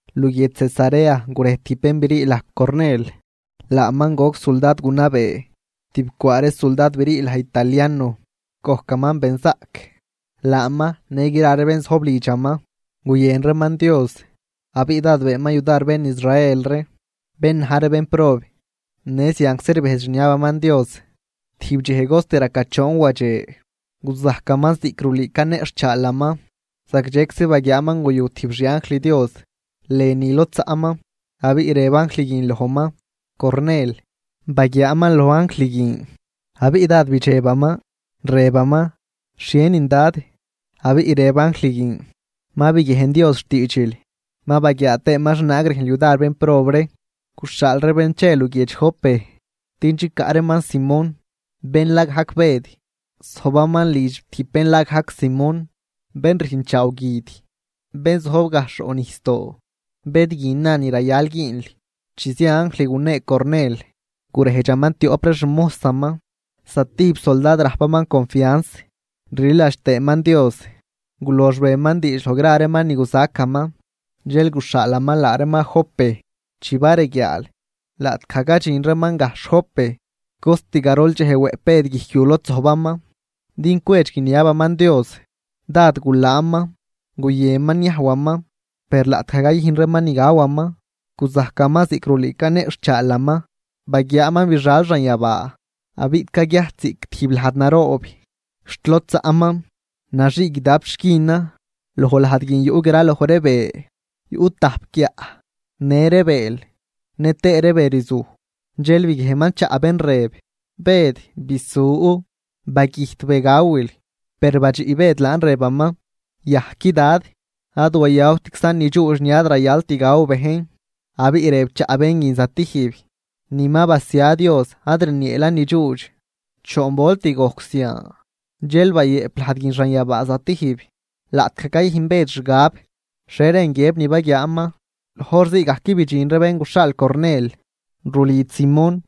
Luguiedx Cesarea gurej tijb bén brii laj Cornel. Laaman goc suldad gunabee tibcwaa ree suldad brii laj Italiano. Gojcaman benzaꞌc, laaman në gra ree bén zojb lidxaman guyën reeman Dios, abiꞌ dád beenman yudar bén Israel ree, bén na̱j ree bénprob, në zianczi rbejdx rniabaman Dios. Tijb dxej cost raca choon wadxe, guzajcaman ziꞌc rulüü caneꞌxhchaalaman. Zagdxeczi baguiaaman guyu tijb xi anjl Dios lënü lod zaꞌman, abiꞌ rëb anjl guin lojman: ―¡Cornel! Baguiaaman loj anjl guin, abiꞌ dád bidxebaman, rëbaman: ―¿Xhienin, Dad? Abiꞌ rëb anjl guin: ―Ma biguiejn Dios xtiidxil ma baguiaa tëëman xhienaag rüjnl yudar bénprob ree. Guxhaal ree bén che luguiedx Jope din chicaꞌ reeman Simón, bén la gajc Bëd. Zojbaman lidx tijb bén la gajc Simón, bén rüjnchaaw guid, bén zojb gajxh roꞌ nijsdoo. Bëd guin na ni rayal güünl. Chi zia anjl gunee Cornel, gurejdxaman tioꞌp ree xmojsaman, zatijb suldad rajpaman confians rliladx tëëman Dios. Gulox beman diidx loj reeman ni guzacaman, dxel guxhaalaman laa reeman Jope. Chi bareguiaal, laꞌtgaj cadxin reeman gajxh Jope, cost garol dxej wëꞌp Bëd guijc yu lod zojbaman din cwedx guiniabaman Dios. Dád gulaanman, guyënman niajwaman, per laꞌtgaj cayüjn reeman ni gawaman guzajcaman ziꞌc rulüü caneꞌxhchaalaman. Baguiaaman bixal xanyabaa abiꞌ caguiajt ziꞌc tijb lajd naroob xt lod zaꞌman, naxii guidap xquinan. Loj lajd guin yuꞌ gra loj ree be yuꞌ tajp guiaꞌ, në ree bëël, nëtëë ree be rzuj. Dxel biguiejnman chaꞌ bén rëb: ―Bëd, bisu, bagüjt be gawil. Per badxiꞌ Bëd laan rëbaman: ―Yajqui, Dad. Ad wayawtczan nidxuudx ni ad rayalt gaw bejn. Abiꞌ rëb chaꞌ bén guin zatijb: ―Ni ma basia Dios ad rnieelan nidxuudx. Choon volt gojc zian, dxel bayëꞌp lajd guin xanyabaa stijb. Laꞌtgaj cayüjn Bëd xgab xhie rën guiëb ni baguiaaman, loj hor zii gajc bidxin ree bén guxhaal Cornel rulidx Simón,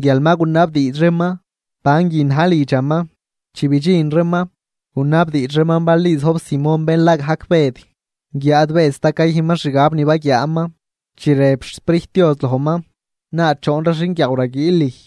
guial ma gunabdiidx reeman banguin na̱j lidxaman. Chi bidxin reeman, gunabdiidx reeman bal ni zojb Simón bén la gajc Bëd. Guiáad Bëd sta cayüjnman xgab ni baguiaaman, chi rëb xSprijt Dios lojman: ―Laa choon ree xinguiaaw raguiil lüj.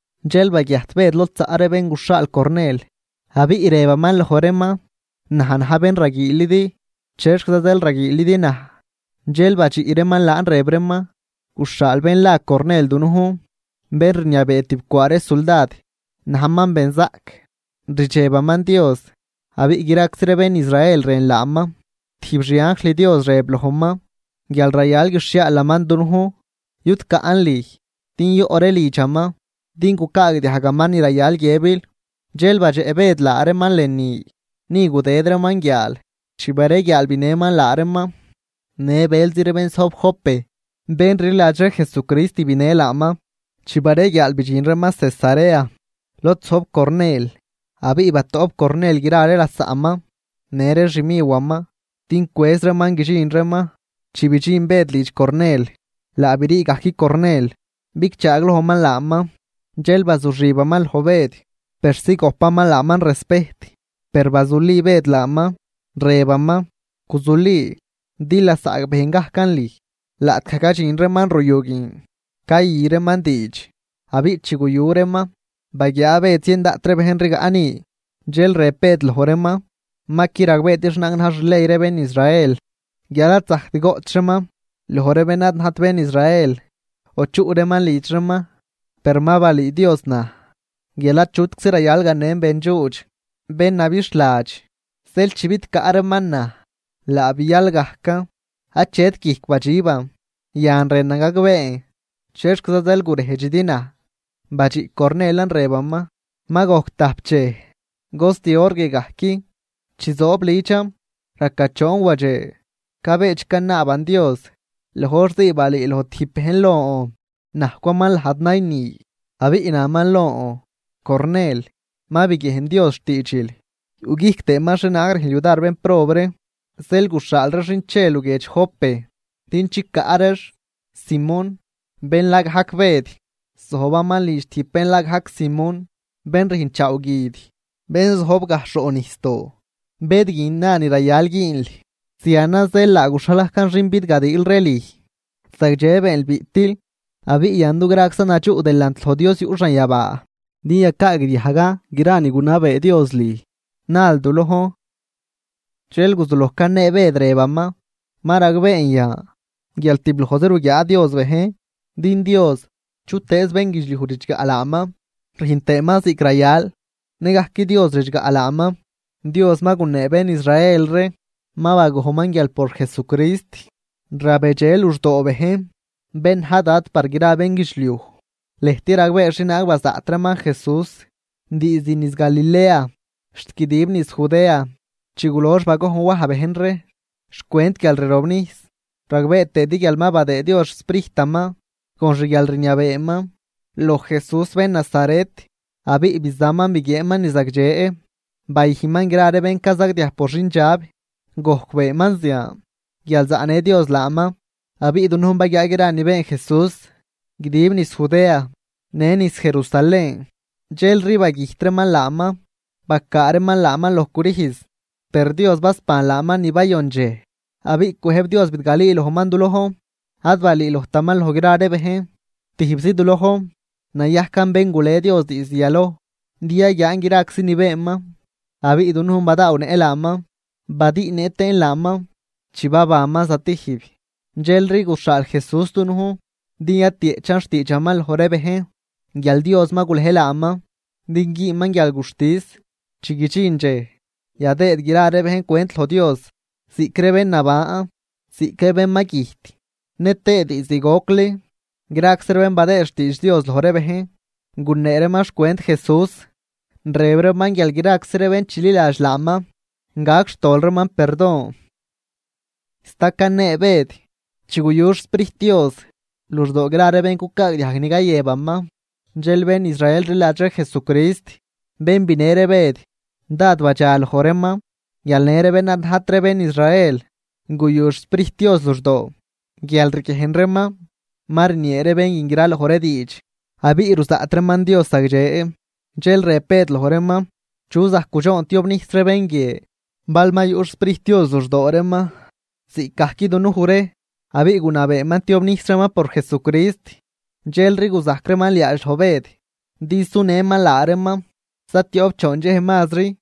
Dxel baguiajt Bëd lod zaꞌ ree bén guxhaal Cornel, abiꞌ rëbaman loj reeman: ―Naj na̱j bén raguiilidi, ¿chexquiza zeel raguiilidi naj? Dxel badxiꞌ reeman laan rëb reeman: ―Guxhaal bén la Cornel dunujn, bén rniabee tibcwaa ree suldad, najman benzaꞌc, rdxebaman Dios, abiꞌ graczi ree bén Israel rën laaman. Tijb xi anjl Dios rëb lojman, guial rayal guixhiaalaman dunujn yudcaꞌn lüj din yoꞌ ree lidxaman, din gucaagdiajgaman ni rayal guiëbil. Dxel badxeꞌ Bëd laa reeman lënü, ni gudëd reeman guiaal. Chi bareguiaal, binëman laa reeman. Në bëlzi ree bén zojb Jope bén rliladx ree Jesucrist binë laaman. Chi bareguiaal bidxin reeman Cesarea lod zojb Cornel. Abiꞌ batoꞌp Cornel gra ree lasaꞌman në ree xmiwaman, din cwëz reeman guidxin reeman. Chi bidxin Bëd lidx Cornel, laa brii gajc Cornel bigchaaglojman laaman, dxel bazuxibaman loj Bëd persi gojpaman laaman respejt. Per bazuli Bëd laaman, rëbaman: ―Guzuli, din lasaꞌ bejn gajcan lüj. Laꞌtgaj cadxin reeman ruyu guin cayü reeman diidx. Abiꞌ chi guyu reeman, baguiaa Bëd zien daꞌt ree bejn rigaꞌ ni. Dxel rëb Bëd loj reeman: ―Ma qui ragbeedi xhienaag na̱j xley ree bén Israel, guial ad zajct goꞌch reeman loj ree bén ad najt bén Israel o chuꞌ reeman lidx reeman. Per ma balüü Dios naj guial achutczi rayal ganen bendxuudx, bén nabixhladx. Zeel chi bidcaꞌ reeman naj, laa bial gajcan achet guijc badxiban. Yan rënan gagbeen, ¿chexquiza zeel gurejdxidi naj? Badxiꞌ Cornelan rëbaman: ―Ma gojc tajp dxej cost hor guie gajc, chi zoob lidxan, raca choon wadxe, cabedx canaaban Dios, loj hor zii balüüloj tijb bejn lon najcwaman lajd nayni. Abiꞌ naman lon: “Cornel, ma biguiejn Dios xtiidxil, yuꞌguijc tëëman xhienaag rüjnl yudar bénprob ree. Zeel guxhaal ree xin che luguiedx la Jope din chicaꞌ reex Simón, bén la gajc Bëd. Zojbaman lidx tijb bén la gajc Simón, bén rüjnchaaw guid, bén zojb gajxh roꞌnijsdoo. Bëd guin na ni rayal güünl.” Zianan zeel laa guxhal gajcan xin bidgadiil ree lüj. Zagdxe beenl biꞌtil. Abiꞌ yan dugraczan nadxuꞌ delant loj Dios yuꞌ xanyabaa, din yacaagdiajgan gra ni gunabee Dios lüj nal du lojn. Dxel guzuloj canee Bëd, rëbaman: ―Ma ragbeen yan guial tiblojzi ruguiaa Dios bejn. Din Dios, chutëëz bénguidxliuj ridxgaꞌ laaman rüjn tëëman ziꞌc rayal, nëgajc Dios ridxgaꞌ laaman. Dios ma gunee bén Israel ree, ma bagojnman guial por Jesucrist rabedxe luxdoo bejn, bén na̱j Dad par gra ree bénguidxliuj. Lëjt ragbee xhienaag bazaꞌt reeman Jesús diizd niz Galilea xt guidib niz Judea, chi gulox bagojn Waj bejn ree xcwent guialrirobnijs. Ragbee tëëdi guial ma badëë Dios xSprijtaman con xguialrniabeeman loj Jesús bén Nazaret, abiꞌ bizaman biguieenman ni zagdxe, bayüjnman gra ree bén cazagdiaj por xindxab. Gojc beenman zian guial zaꞌnë Dios laaman. Abiꞌ dunujn baguiaa gra ni been Jesús guidib niz Judea, në niz Jerusalén. Dxelri bagüjt reeman laaman, bacaa reeman laaman loj crüjz. Per Dios basban laaman ni bayon dxej, abiꞌ cwëjb Dios bidgalüülojman du lojn. Ad balüülojtaman loj gra ree bejn, tijbzi du lojn nayajcan bén gule Dios diizd yaloj din yaguiaan graczi ni beenman. Abiꞌ dunujn badaawnëꞌ laaman badüꞌnëꞌ tëën laaman chi babanman stijb. Dxelri guxhaal Jesús dunujn din yatieꞌchan xtiidxaman loj ree bejn, guial Dios ma gulej laaman din güünman guialguxtis chi guidxin dxej yadëëd gra ree bejn cwent loj Dios, ziꞌc ree bén naban ziꞌc ree bén ma güjt. Nëtëë diizd gocli graczi ree bén badëëd xtiidx Dios loj ree bejn, gunee reeman xcwent Jesús, rëb reeman guial graczi ree bén chililadx laaman, gac xtol reeman perdon. Sta canee Bëd, chi guyu xSprijt Dios luxdoo gra ree bén cucaagdiajg ni cayëbaman. Dxel bén Israel rliladx ree Jesucrist, bén binë ree Bëd, dád badxa loj reeman guial në ree bén ad najt ree bén Israel guyu xSprijt Dios luxdoo, guial riguiejn reeman ma rniee ree bén guin graloj ree diidx, abiꞌ ruzaꞌt reeman Dios zagdxe. Dxel rëb Bëd loj reeman: ―¿Chu zajc gudxoon tiobnijs ree bén guie, bal ma yuꞌ xSprijt Dios luxdoo reeman ziꞌcgajc dunuj ree? Abiꞌ gunabeeman tiobnijs reeman por Jesucrist. Dxelri guzajc reeman liaadx loj Bëd din sunëman laa reeman za tioꞌp choon dxej mazri.